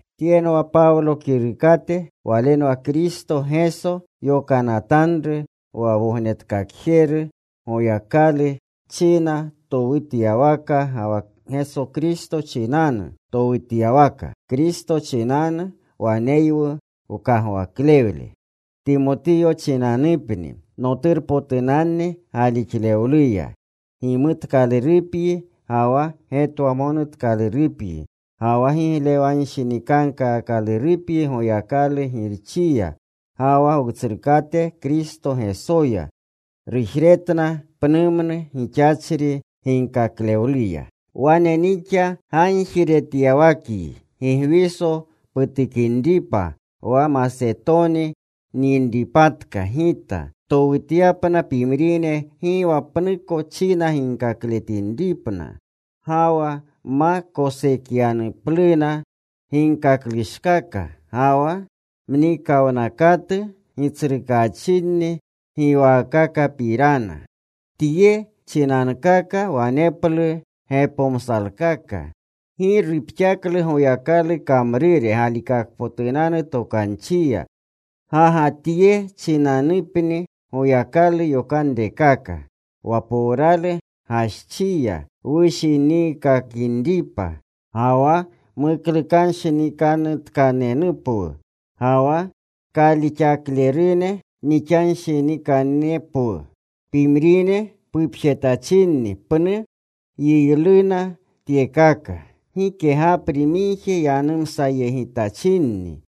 Tyenwa Pawlo kirukate. Walenwa Kristo Geso yokanatanru, wa Wognetkakjeru Goyakalu china towutyawaka, ga wa Kristo Geso china towutyawaka. Kristo chinanu waneywu wkagwakle. Timotiyo chinanupni, noturpotunanni galixluya. Gimutkalurupyi ga wa getwamonutkalurupyi, ga wa giglewanshinikankaakalurupyi Goyakalu Girchiya ga wa Wutsrukate Kristo Gesoya. Rujretna pnumnu gixachri ginkaklewluya Wane nixa gagjiretyawakyi Gigwiso putukinripa wa Masetoni nyinpatka gita, ptowutyapna pimrine gi wa pnuko china ginkaklewletinripna. Ga wa ma koschekyanupluna ginkaklushkaka ga wa mnikawnakatu gitsrukaachinni giwaakakapirana. Tye chinankaka waneplu gepomsalkaka. Gi rupxaklu Goyakalu kamrure galikakpotutanu tokanchiya. Ga ga tye chinanupni Goyakalu yokanrekaka: wa powrawlu gaschiya wushiniikakanripa ga wa muklukanuwnanshinikanutkanepwu, ga wa kalixaklerune mixashatkanepwu. Pimrine pupjetachinni pnu yiyluna tyekaka. Gike gapri migje yanumsayegitachinni.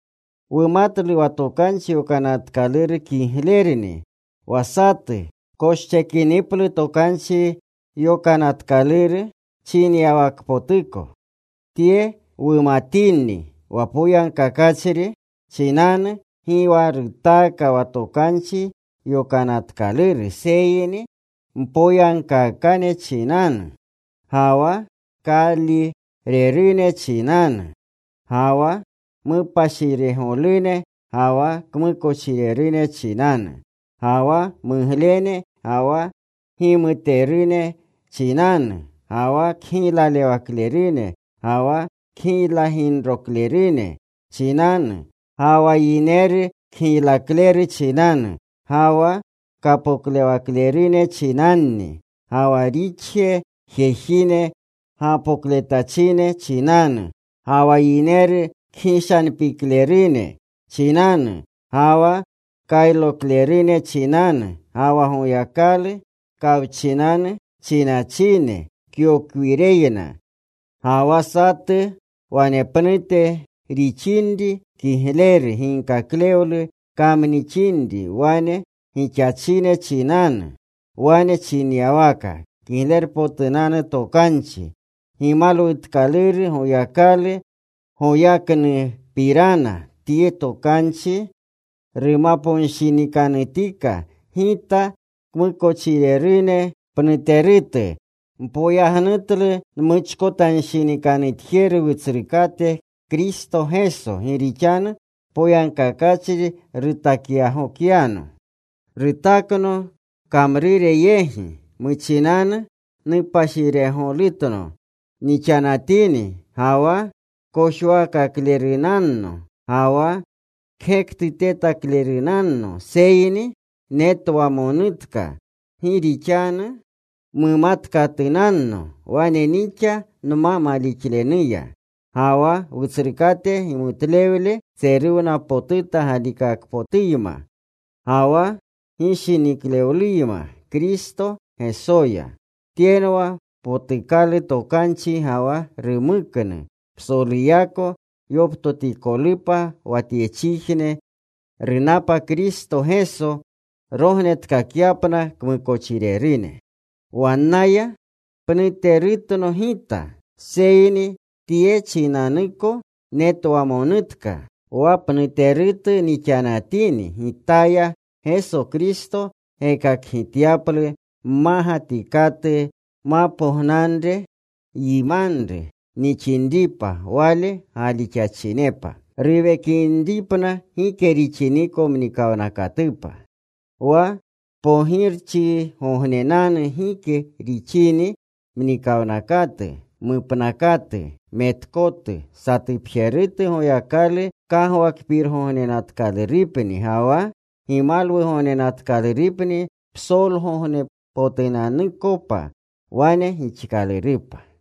Wumatlu wa Tokanchi Yokanatkaluru kiglerni, wa satu koschekiniplu Tokanchi Yokanatkaluru chinyawakpotuko. Tye wumatini, wa poyagkakachri chinanu gi wa rutaaka wa Tokanchi Yokanatkaluru, seyni mpoyagkaakane chinanu, ga wa kaalirerune chinanu, ga wa mupashiregolune ga wa kmukochirerune chinanu, ga wa muglene ga wa gimuterune chinanu, ga wa kgiylagiruklerune ga wa kgiylaginroklerune chinanu, ga wa yineru kgiylaklerune chinanu. Ga wa kapoklewaklerune chinanni, ga wa rixje jejine gapokletachine chinanu, ga wa yineru kgishanpiklerune chinanu, ga wa kayloklerune chinanu, ga wa Goyakalu kawchinanu chinachine yokwireyna, ga wa satu wanepnute rixinri kigleru ginkaklewlu kamnixinri wane gixachine chinanu. Wane chinyawaka Kiglerpotunanu Tokanchi gimalwutkaluru Goyakalu goyaknupirana. Tye tokanchi numaponshinikanutika gita. Kmukochirerune pnuterutu. Npoyagnutlu nmuchkotanshinikanutjeru Wutsrukate Kristo Geso. Gi rixanu poyagkakachri rutakyagokyano. Rutakno kamrure yegi. Muchinanu mupashiregolutno nixanatini, ga wa kojwakaklerunanno, ga wa kgektutetaklerunanno. Seyni netwamonutka gi rixanu mumatkatunanno wane nixa nma malixlenuya. Ga wa Wutsrukate gimutlewle tseruwnapotuta galixlewluyma, ga wa gishiniklewluyma Kristo Gesoya. Tyenwa potukalu tokanchi ga wa rumuknu psoluyako yoptotikolupa, wa tyechijne runapa Kristo Geso rognetkakyapna kmukochirerune. Wannaya pnuterutno gita. Seyni tye chinanuko netwamonutka, wa pnuterutu nixanatini, gitaya Geso Kristo gekakgityaplu mmagatikatu mapognanre, yimanru nixinripa Wale galixachinepa, ruwekinripna gike rixiniko mnikawnakatupa. Wa pogirchigognenanu gike rixiniko mnikawnakatu, mupnakatu, metkotu, satupjerutu Goyakalu kagwakpirgognenatkalurupni ga wa gimalwugognenatkalurupni psolgognepotunanukopa. Wane gixkalurupa.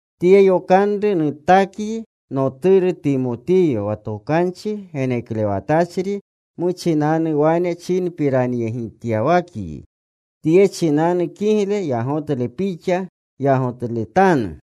Tye yokanru nutakyi, noturu Timotiyo, wa tokanchi geneklewatachri muchinanu wane chinpiranyegityawakyi, tye chinanu kigle yagotle pixa yagotletanu.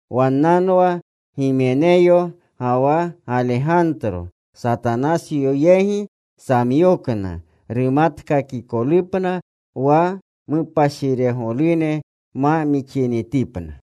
Wannanwa Gimenyo ga wa Galegantro. Satanasyo yegi nsamyokna rumatkakikolupna wa mupashiregolune ma mixinitipna.